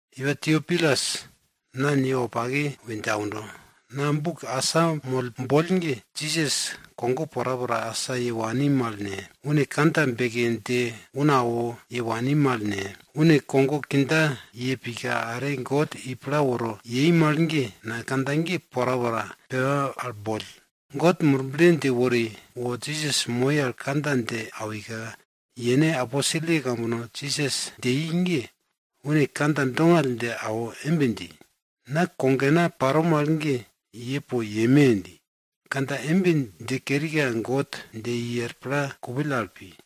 Iwa Teopilus, na ni wopake we dje aundo. Na buk asamoll boll ge, Jisas kogo porapora asa ye wani mal ne, une kandja beke dje una awo ye wani mal ne, une kogo kindja ye pika, are God i pla woro yei mal ge, na kandja ge porapora pepa al boll. God Murble dje wori, wo Jisas moi al kandja dje awika, yene aposelye kambono Jisas dje i ge, une kandja dongall dje awo embe dji, na kogena paro mal ge ye po yeme! dji. Kandja embe dje kerika God dje i er pla kupill al pi.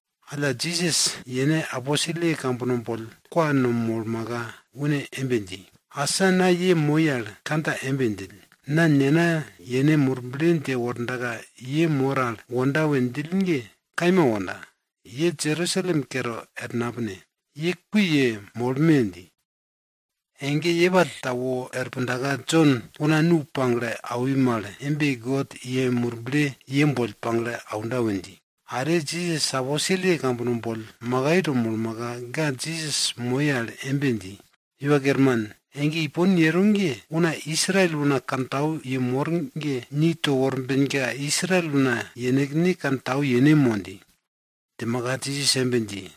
Alla, Jisas yene aposelye kambono boll kwa no molmaka, une embe dji, asa na ye moi al kandja embe djill, na Nena yene Murble dje wordaka ye mor al wonda we djill ge, kaima wonda, ye Jerusalem kere er napine. Ye kui yemolme! dji. Ege yepall ta wor pundaka, Jon una nu pagle awi mal embe God yene Murble i ye boll pagle aunda we dji. Are, Jisas aposelye kambono boll makai to molmaka, ga Jisas moi al embe dji, Iwa Kerman, ege ipon yero ge, una Israel una kantau yemor ge, ni to worbenka Israel una yenekne kantau yene mo? dji. Djimaka Jisas embe dji,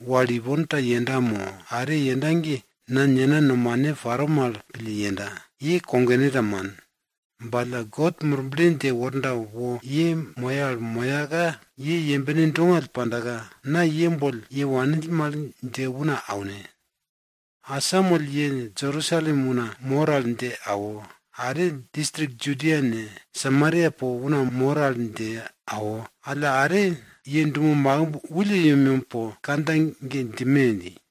wal ipon ta yenda mo are yenda ge, na nena nomane paro mal pille yenda. Ye kogone ta man. Ba alla God Murble dje worda wo ye moye al moyaka, ye yembene dongall pandaka, na ye boll ye wanill mal dje una aune. Asamoll ye Jerusalem una mor al dje awo, are distrik Judia ne, Samaria po una mor al dje awo, alla are ye dumo makimb wulle yemyem po kandja ge djime! dji.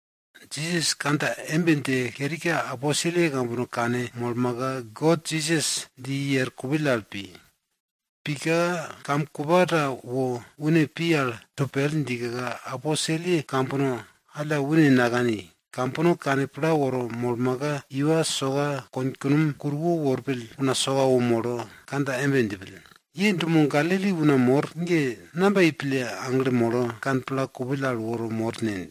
Jisas kandja embe dje kerika, aposelye kambono kanmolmaka, God Jisas dje i er pla kupill al pika, kam kupa ta wo une pi al to pel djika, aposelye kambono alla une nakani. Kambono kane pla woro molmaka, iwa soka konkunom kuruwo worpill una soka wo molo kandja embe djipill, ye dumo Galili una mor ge, namba yei pille aglo molo kane pla kupill al woro mor ne?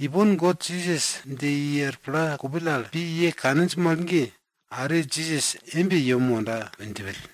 Ipon God Jisas dje i er pla kupill al pi ye kaninj mal ge, are Jisas embe yem wonda we djipill.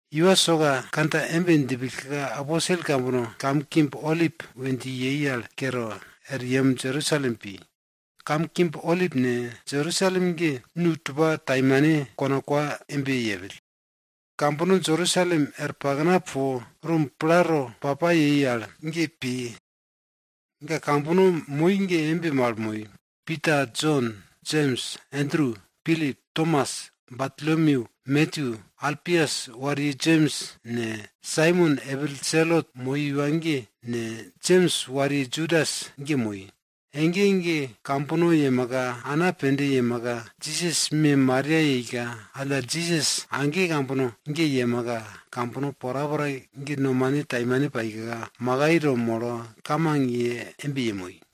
Iwa soka kandja embe djipillka, aposel kambono kam mekbe Olip we dji ge kere, er yem Jerusalem pi. Kam mekbe Olip ne, Jerusalem ge nu tupa taimane kona kwa embe yepill. Kambono Jerusalem er pakna po rum plato pa pa yei al ge pi. Ga kambono moi ge embe mal moi. Pita, Jon, Jems, Endru, Pilip, Tomas, Bartolomyu, Matyu, Alpias wariye Jems ne, Saimon epil Selot moi iwa ge ne, Jems wariye Judas ge moi. Ege ege kambono yemaka, ana pende yemaka, Jisas me Maria yeika, alla Jisas age kambono ge yemaka, kambono porapora ge nomane taimane paika, makai to molo, kamang yemoi.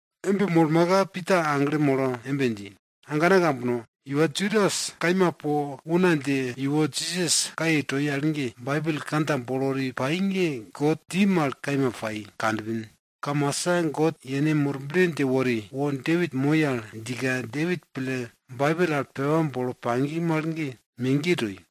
Embe molmaka, Pita aglo molo embe dji, agana ambana kambono, iwa Judas kaima po una dje iwo Jisas kaye toi al ge, Baibel kandja bolo wori pai ge God dji mal kaima pai kanpin. Kamasa God yene Murble dje wori, wo Depit moi al djika Depit pille Baibel al pepa bolo pagi mal ge, megiye toi.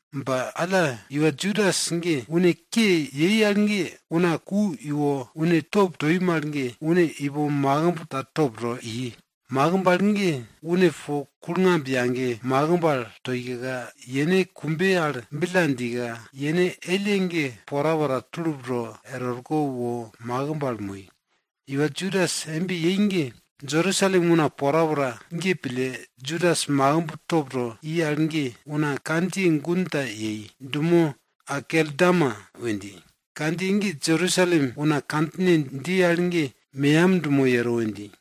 Ba alla iwa Judas ge une ke yei al ge, una ku iwo une top toi mal ge, une ipo makimb ta top to i, makimb al ge, une po kulngamb yage makimb al toika, yene kumbe al billa djika, yene elle ge porapora, tulup to er orko wo makimb al moi. Iwa Judas embe yei ge, Jerusalem una porapora ge pille, Judas makimb top to i al ge, una kandjiye gun ta yei dumo Akeldama we dji. Kandjiye ge Jerusalem una kandjine dji al ge meyam dumo yero we dji.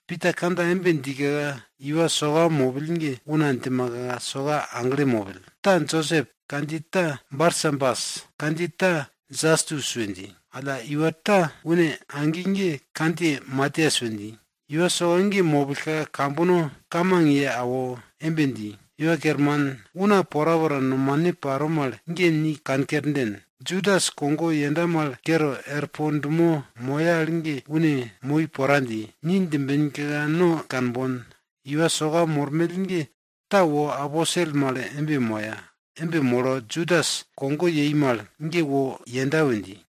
Pita kandja embe djika, iwa soka mopill ge una djimaka soka aglo mopill. Ta Josep kandjiye ta Barsabas, kandjiye ta Jastus we dji. Alla, iwa ta une agi ge kandjiye Matias we dji. Iwa soka ge mopillka, kambono kamang ye awo embe dji, Iwa Kerman, una porapora nomane paro mal ge ni kankerden. Judas kogo yenda mal kere er po dumo moya al ge une pi pora dji, ni djimbenka no kanbon, iwa soka mormell ge ta wo aposel mal moya. Embe molo, Judas kogo yei mal ge wo yenda we dji.